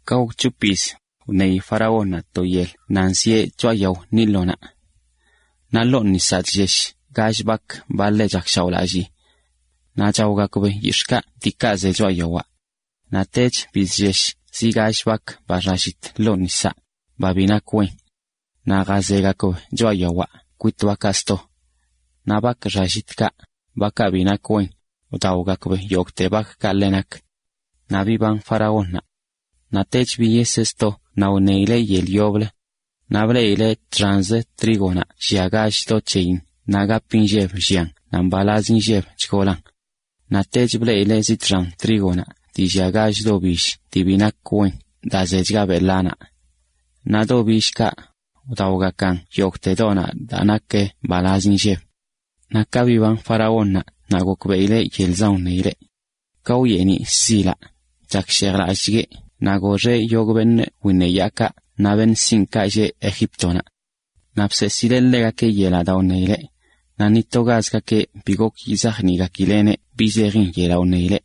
Ka gok c̱hop yiz, wṉeyi faraónnaꞌ to yel nan zieꞌ choꞌa yao Nilonaꞌ. Naꞌ ḻoo nisaꞌ chllesh gall bak, ba ḻe chakshaoꞌlallii, naꞌ chaogakb yix̱ꞌkaꞌ diikaꞌ ze choꞌa yawaꞌ. Naꞌtech bizllesh zi gall bak ba xallit ḻoo nisaꞌ, ba bi nak wen. Naꞌ jazegakb choꞌa yawaꞌ kwit bakaꞌ sto. Naꞌ bak xallitkaꞌ, bakaꞌ bi nak wen, wdaogakb yogꞌte bakkaꞌ ḻe nak. Naꞌ biban faraónnaꞌ. Naꞌtech biyeseꞌ sto naꞌ wṉeyileꞌ yel yoblə. Naꞌ bleꞌileꞌ txanzə trígonaꞌ llia gall do c̱heyin naꞌ gap inlleb llian naꞌ mbalazi nlleb chgolan. Naꞌtech bleꞌileꞌ zi txan trígonaꞌ dii llia gall do bill dii bi nak wen daa zechga beꞌ ḻanaꞌ. Naꞌ do billkaꞌ, wdaogakan yogꞌte donaꞌ daa nak mbalaz inlleb(). Naꞌ ka biban faraónnaꞌ naꞌ gokbeꞌileꞌ yelzan wṉeyileꞌ. Ka wyeeniꞌ shzilaꞌ, chakshejlallꞌchgueꞌ naꞌ goxeꞌ yogꞌ beṉꞌ wiṉeyaakaꞌ naꞌ beṉꞌ sinꞌkaꞌ lleꞌ Egíptonaꞌ. Naꞌ bseesileꞌ ḻegakeꞌ yelaꞌ daa wṉeyileꞌ, naꞌ ni togazgakeꞌ bi gok yizajniꞌgakileꞌneꞌ bi zejin yelaꞌ wṉeyileꞌ.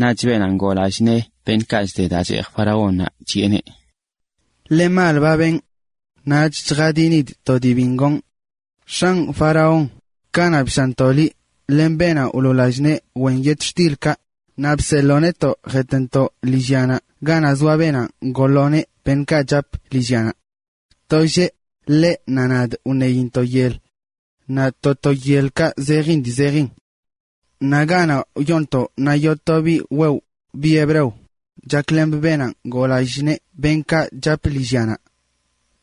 Naꞌch beenaꞌ ngoo lallꞌ nee beṉꞌkaꞌ chde daa cheej faraónnaꞌ chiꞌeneꞌ: ―Ḻe mal ba benꞌ. Ṉaach chjadinidꞌ to dii biṉꞌ gonꞌ. X̱anꞌ faraón, kanaꞌ bshaantoꞌ liꞌ, len beenaꞌ wloo lallꞌ nee wen yetxtilkaꞌ, naꞌ bseḻoo netoꞌ jetꞌntoꞌ lillyanaꞌ ganaꞌ zoa beenaꞌ ngoo lo nee beṉꞌkaꞌ chap lillyanaꞌ. To lleꞌ, ḻeꞌ naꞌ nadꞌ wṉeyintoꞌ yel. Naꞌ to to yelkaꞌ zejin dii zejin. Naꞌ ganaꞌ wyoontoꞌ naꞌ yoo to biꞌ wewꞌ, biꞌ hebreo, chaklemꞌ beenaꞌ ngoo lallꞌ nee beṉꞌkaꞌ chap lillyanaꞌ.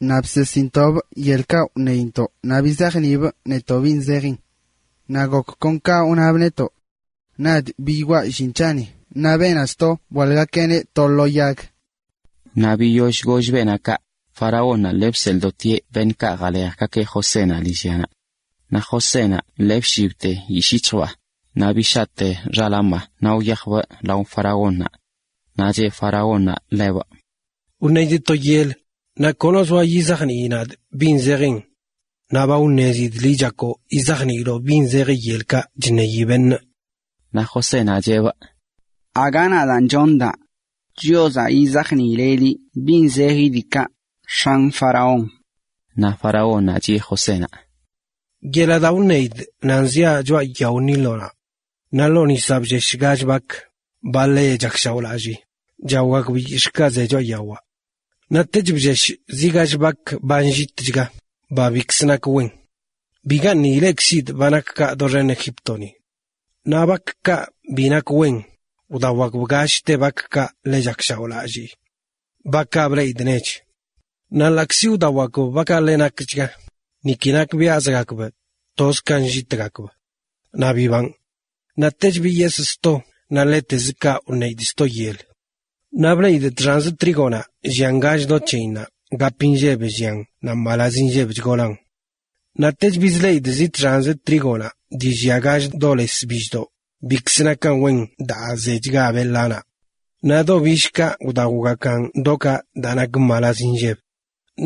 Naꞌ bseesintoꞌbꞌ yelkaꞌ wṉeyintoꞌ naꞌ bizajniibꞌ netoꞌ bin zejin. Naꞌ gok kon ka wnabꞌ netoꞌ. Nadꞌ biyoꞌa llin c̱haꞌni naꞌ beenaꞌ sto bwaḻꞌgakeꞌneꞌ to lo yag. Naꞌ biyoll goll beenaꞌ kaꞌ, faraónnaꞌ lii bseḻꞌdotieꞌ beṉꞌkaꞌ jalejgakeꞌ Josénaꞌ lillyanaꞌ. Naꞌ Josénaꞌ ṉaa lii bshibte yishꞌ yic̱hjbaa, naꞌ bishaꞌtebꞌ xaḻaamaa naꞌ wyajbꞌ lao faraónnaꞌ. Naꞌ cheꞌ faraónnaꞌ ḻebꞌ: ―Wṉeidꞌ to yel, naꞌ kono zoa yizajnii nadꞌ bin zejin. Naꞌ ba wṉezidꞌ liꞌ chak yizajniiloꞌ bi zejin yelkaꞌ chṉeyi beṉꞌ. Naꞌ Josénaꞌ cheꞌbꞌ: ―Aga nadaan chonꞌ daa. Chiozaꞌ yizajniileꞌ liꞌ bi zejin diikaꞌ, x̱anꞌ faraón. Naꞌ faraónnaꞌ chiꞌe Josénaꞌ: ―Yelaꞌ daa wṉeidꞌ nan ziaꞌ choꞌa yao Nilonaꞌ. Naꞌ ḻoo nisaꞌ bllesh gall bak, ba ḻe chakshaoꞌlallii, chaogakb yix̱ꞌkaꞌ ze choꞌa yawaꞌ. Naꞌtech bllesh zi gall bak ba nllitchga, ba bikzə nak wen. Bigaṉꞌ ilekzidꞌ ba nak kaꞌ doxen Egíptoni. Naꞌ bakkaꞌ bi nak wen, wdaogakb gallte bakkaꞌ ḻe chakshaoꞌlallii, bakaꞌ bleꞌidꞌ nech. Naꞌ ḻaꞌkzi wdaogakb bakaꞌ ḻe nakchga, niki nakbiaꞌzgakb; toz ka nllitgakb. Naꞌ bibanꞌ. Naꞌtech biyesꞌ sto naꞌ ḻetez kaꞌ wṉeidꞌ sto yel. Naꞌ bleꞌidꞌ txanzə trígonaꞌ llia gall do c̱heyin naꞌ gap inlleb llian naꞌ mbalaz inlleb chgolan. Naꞌtech bizleꞌidꞌ zi txanz trígonaꞌ dii llia gall do les billdoꞌ, bikzə nakan wen daa zechga beꞌ ḻanaꞌ. Naꞌ do billkaꞌ wdaogakan dokaꞌ daa nak mbalaz inlleb.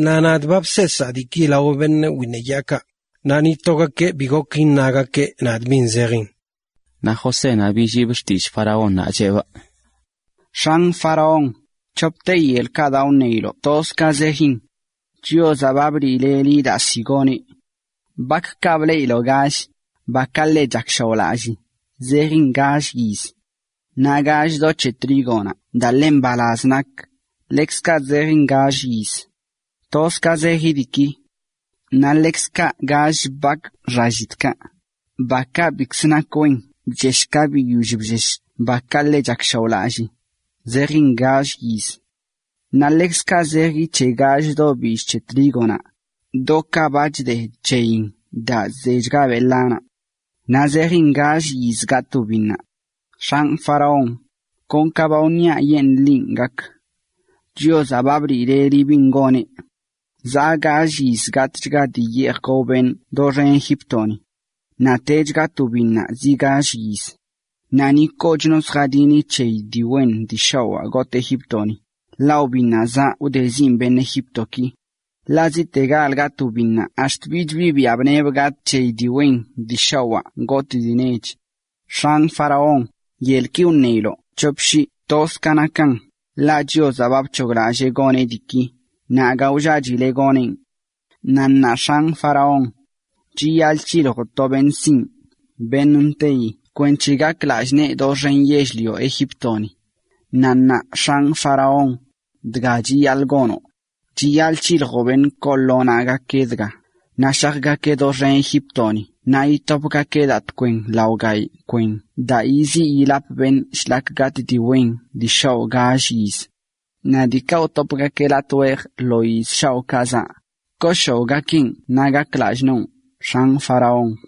Naꞌ nadꞌ ba bseesaa diiki lao beṉꞌ wiṉeyaakaꞌ, naꞌ ni togakeꞌ bi gok iṉagakeꞌ nadꞌ bin zejin. Naꞌ Josénaꞌ billiibꞌ xtillꞌ faraónnaꞌ, cheꞌbꞌ: ―X̱anꞌ faraón, c̱hopte yelkaꞌ daa wṉeiloꞌ toz ka zejin. Chiozaꞌ ba bliileꞌ liꞌ daa ziꞌ goneꞌ. Bakkaꞌ bleꞌiloꞌ gall, bakaꞌ ḻe chakshaoꞌlallii, zejin gall yiz. Naꞌ gall do c̱he trígonaꞌ daa ḻe mbalaz nak, ḻekzkaꞌ zejin gall yiz. Toz ka zeji diiki. Naꞌ ḻekzkaꞌ gall bak xallitkaꞌ, bakaꞌ bikzə nak wen bllesh ka biyoll bllesh bakaꞌ ḻe chakshaoꞌlallii, zejin gall yiz. Naꞌ ḻekzkaꞌ zeji c̱he gall do bill c̱he trígonaꞌ, dokaꞌ ba chde c̱heyin daa zechga beꞌ ḻanaꞌ. Naꞌ zejin gall yiz gatꞌ wbinnaꞌ. X̱anꞌ faraón, kon ka ba wṉiaꞌyeṉaa linꞌ gak. Chiozaꞌ ba bliileꞌ liꞌ bin goneꞌ. Zaꞌ gall yiz gatꞌchga dii yeej gao beṉꞌ doxen Egíptoni. Naꞌtech gatꞌ wbinnaꞌ zi gall yiz naꞌ ni kochno lljadini c̱heyi dii wen dii shawaa gotꞌ Egíptoni, ḻaꞌ wbinnaꞌ zaꞌ wdezinꞌ beṉꞌ Egíptoki. Ḻaꞌ ziꞌtegalan gatꞌ wbinnaꞌ ax̱t bich bi biaꞌ bṉebə gatꞌ c̱heyi dii wen dii shawaa gotꞌ dii nech. X̱anꞌ faraón, yelki wṉeiloꞌ c̱hop shii toz ka nakan, ḻaꞌ Chiozaꞌ ba bc̱hoglallee goneꞌ diiki, naꞌ aga wllachileꞌ, goneꞌn. ’Naꞌ ṉaa, x̱anꞌ faraón, chiyaḻꞌ c̱hiljoꞌ to beṉꞌ sinꞌ beṉꞌ nteyi kwenc̱he gak lallꞌ nee doxen yell-lio Egíptoni. Naꞌ ṉaa, x̱anꞌ faraón, dga chiyaḻꞌ gonoꞌ: chiyaḻꞌ c̱hiljoꞌ beṉꞌ koo lo naꞌgakeꞌ dga, naꞌ shajgakeꞌ doxen Egíptoni naꞌ itopgakeꞌ daa tkwen lao gayꞌ kwen daa yiziꞌ yilap beṉꞌ shlak gatꞌ dii wen dii shawaa gall yiz. Naꞌ diikaꞌ wtopgakeꞌ latꞌ wejə lo yiz shaoꞌkaꞌ zaꞌ, kooshaoꞌgakeꞌn yell xenkaꞌ naꞌ gakan lallꞌ noo, x̱anꞌ faraón.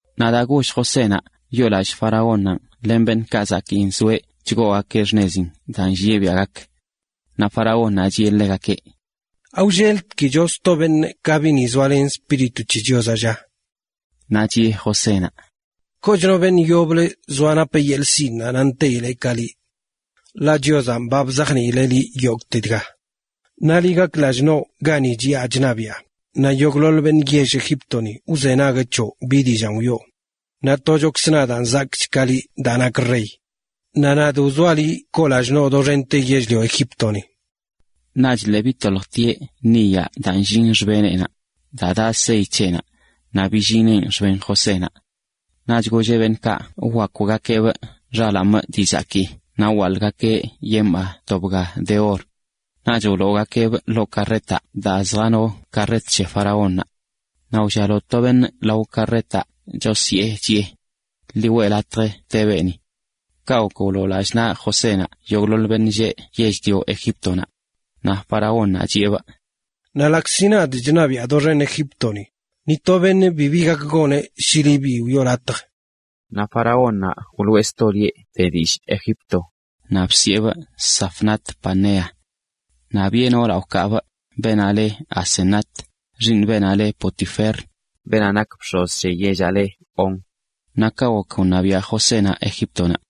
Naꞌ dga goll Josénaꞌ wyoolallꞌ faraónnanꞌ len beṉꞌkaꞌ zakii nzoeꞌ chgoogakeꞌ xṉezin daa nllieꞌ biaꞌ gak. Naꞌ faraónnaꞌ chiꞌe ḻegakeꞌ: ―¿Awlleltkicho sto beṉꞌ ka biꞌni zoalen Espíritu c̱he Chiozaꞌ, lla? Naꞌ chiꞌe Josénaꞌ: ―Kochno beṉꞌ yoblə zoa napeꞌ yeḻꞌ sinꞌnaꞌ naꞌ nteyileꞌ ka liꞌ. Ḻaꞌ Chiozanꞌ ba bzajniileꞌ liꞌ yogꞌte dga. Naꞌ liꞌ gak lallꞌ noꞌ gani chiꞌa chṉabiꞌa, naꞌ yogꞌḻoḻ beṉꞌ lleꞌ yell Egíptoni wzenagueꞌ c̱hoꞌ bi dillaan wiꞌo. Naꞌ tochokzə nadꞌ zakꞌchꞌ ka liꞌ daa nakꞌ rey. Naꞌ nadꞌ wzoaꞌ liꞌ koo lallꞌ noꞌ doxente yell-lio Egíptoni. Naꞌch lii bitoljtieꞌ niyaꞌ daa nllin xbeneꞌnaꞌ, daa daꞌ sey c̱heꞌnaꞌ, naꞌ billineꞌn xben Josénaꞌ. Naꞌch golleꞌ beṉꞌkaꞌ wwakwgakeꞌneꞌ xalaaneꞌ(ee) dii zakii naꞌ wwaḻꞌgakeꞌ yeneꞌnaꞌ to bga de or. Naꞌch wloogakeꞌneꞌ ḻoo karretaꞌ daa lii chjanote karret c̱he faraónnaꞌ. Naꞌ wllialo to beṉꞌ lao karretaꞌ chosyee, chiꞌe: “Ḻi weꞌ latj te beeni.” Kaꞌ gok wloo lallꞌ naꞌ Josénaꞌ yogꞌḻoḻ beṉꞌ lleꞌ yell-lio Egíptonaꞌ. Naꞌ faraónnaꞌ chiꞌeneꞌ: ―Ḻaꞌkzi nadꞌ chṉabiꞌa doxen Egíptoni, ni to beṉꞌ bibi gak goneꞌ shi liꞌ bi wiꞌo latj. Naꞌ faraónnaꞌ wloꞌe sto lieꞌ de dillꞌ Egipto, naꞌ bsiꞌeneꞌ Zafnat-panea. Naꞌ biꞌe noolaꞌ wkee beenaꞌ leꞌ Asenat, xiiṉ beenaꞌ leꞌ Potifer, beenaꞌ nak bx̱oz c̱he yellaꞌ leꞌ On. Naꞌ kaꞌ gok wṉabiaꞌ Josénaꞌ Egíptonaꞌ.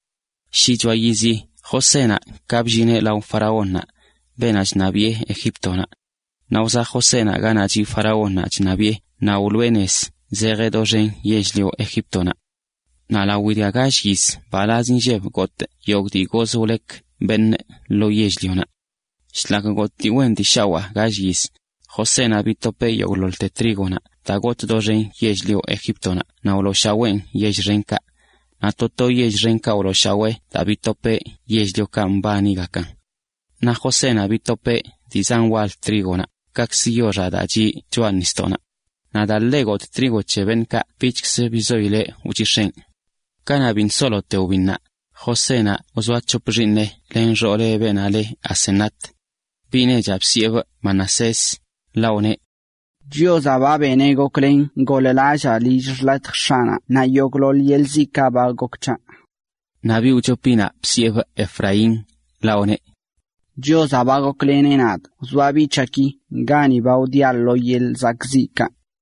Shichoa yizi Josénaꞌ ka bllineꞌ lao faraónnaꞌ, beenaꞌ chṉabiꞌe Egíptonaꞌ. Naꞌ wzaꞌ Josénaꞌ ganaꞌ chiꞌ faraónnaꞌ chṉabiꞌe naꞌ wloꞌe nez zejeꞌ doxen yell-lio Egíptonaꞌ. Naꞌ lawi dga gall yiz gotꞌchga yogꞌte dii goz wlek beṉꞌ. Shlak gotꞌ dii wen dii shawaa gall yiz, Josénaꞌ bitopeꞌ yogꞌḻoḻte trígonaꞌ daa gotꞌ doxen yell-lio Egíptonaꞌ naꞌ wlooshaween yell xenkaꞌ. Naꞌ to to yell xenkaꞌ wlooshawee daa bitopeꞌ yell-liokaꞌ mbanigakan. Naꞌ Josénaꞌ bitopeꞌ dii zan wal trígonaꞌ, kakzə() yoxaꞌ daa chiꞌ choꞌa nisdoꞌnaꞌ. Naꞌ daa ḻe gotꞌ trigo c̱he beṉꞌkaꞌ bichkzə bizoileꞌ wchix̱eꞌn. Kanaꞌ biṉꞌ solote wbinnaꞌ, Josénaꞌ wzoa c̱hop xiiṉeꞌ len xooleꞌ beenaꞌ leꞌ Asenat. Bi nechaꞌ bsiꞌebꞌ Manasés, ḻaꞌ wneꞌ: “Chiozaꞌ ba beneꞌ goklen goḻ-lallaa lill xḻatj x̱aꞌnaꞌ naꞌ yogꞌḻoḻ yeḻꞌ ziꞌkaꞌ ba gok c̱haꞌ.” Naꞌ biꞌ wchopinaꞌ bsiꞌebꞌ Efraín, ḻaꞌ wneꞌ: “Chiozaꞌ ba gokleneꞌ nadꞌ wzoa biꞌ c̱haꞌki gani ba wdiaꞌ lo yeḻꞌ zakꞌziꞌkaꞌ.”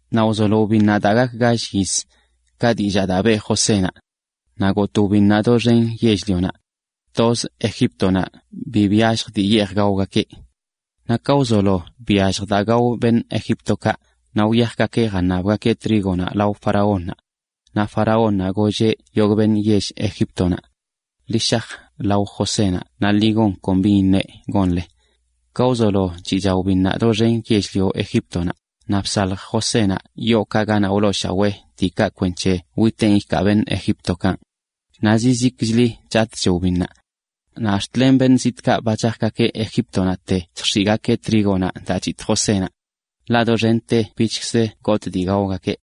naꞌ wzolo wbinnaꞌ daa wcheꞌ zi gall yiz, ka dillaa daa beꞌ Josénaꞌ. Naꞌ gotꞌ wbinnaꞌ doxen yell-lionaꞌ. Tozə Egíptonaꞌ bi byallj dii yeej gaogakeꞌ. Naꞌ ka wzolo byallj daa gao beṉꞌ Egíptokaꞌ, naꞌ wyajgakeꞌ jaṉabgakeꞌ trígonaꞌ lao faraónnaꞌ. Naꞌ faraónnaꞌ golleꞌ yogꞌ beṉꞌ yell Egíptonaꞌ: “Ḻi shaj lao Josénaꞌ naꞌ ḻi gon kon bin iṉeꞌ gonle.” Ka wzolo chiꞌcha wbinnaꞌ doxen yell-lio Egíptonaꞌ, naꞌ bsalj Josénaꞌ yookaꞌ ganaꞌ wlooshawee diikaꞌ kwenc̱he witeen ikaa beṉꞌ Egíptokaꞌn. Naꞌ zizikchli chatꞌch wbinnaꞌ. Naꞌ ax̱t len beṉꞌ zitꞌkaꞌ ba chajgakeꞌ Egíptonaꞌte chjx̱iꞌgakeꞌ trígonaꞌ daa chitꞌ Josénaꞌ. Ḻaꞌ doxente bichkzə gotꞌ dii gaogakeꞌ.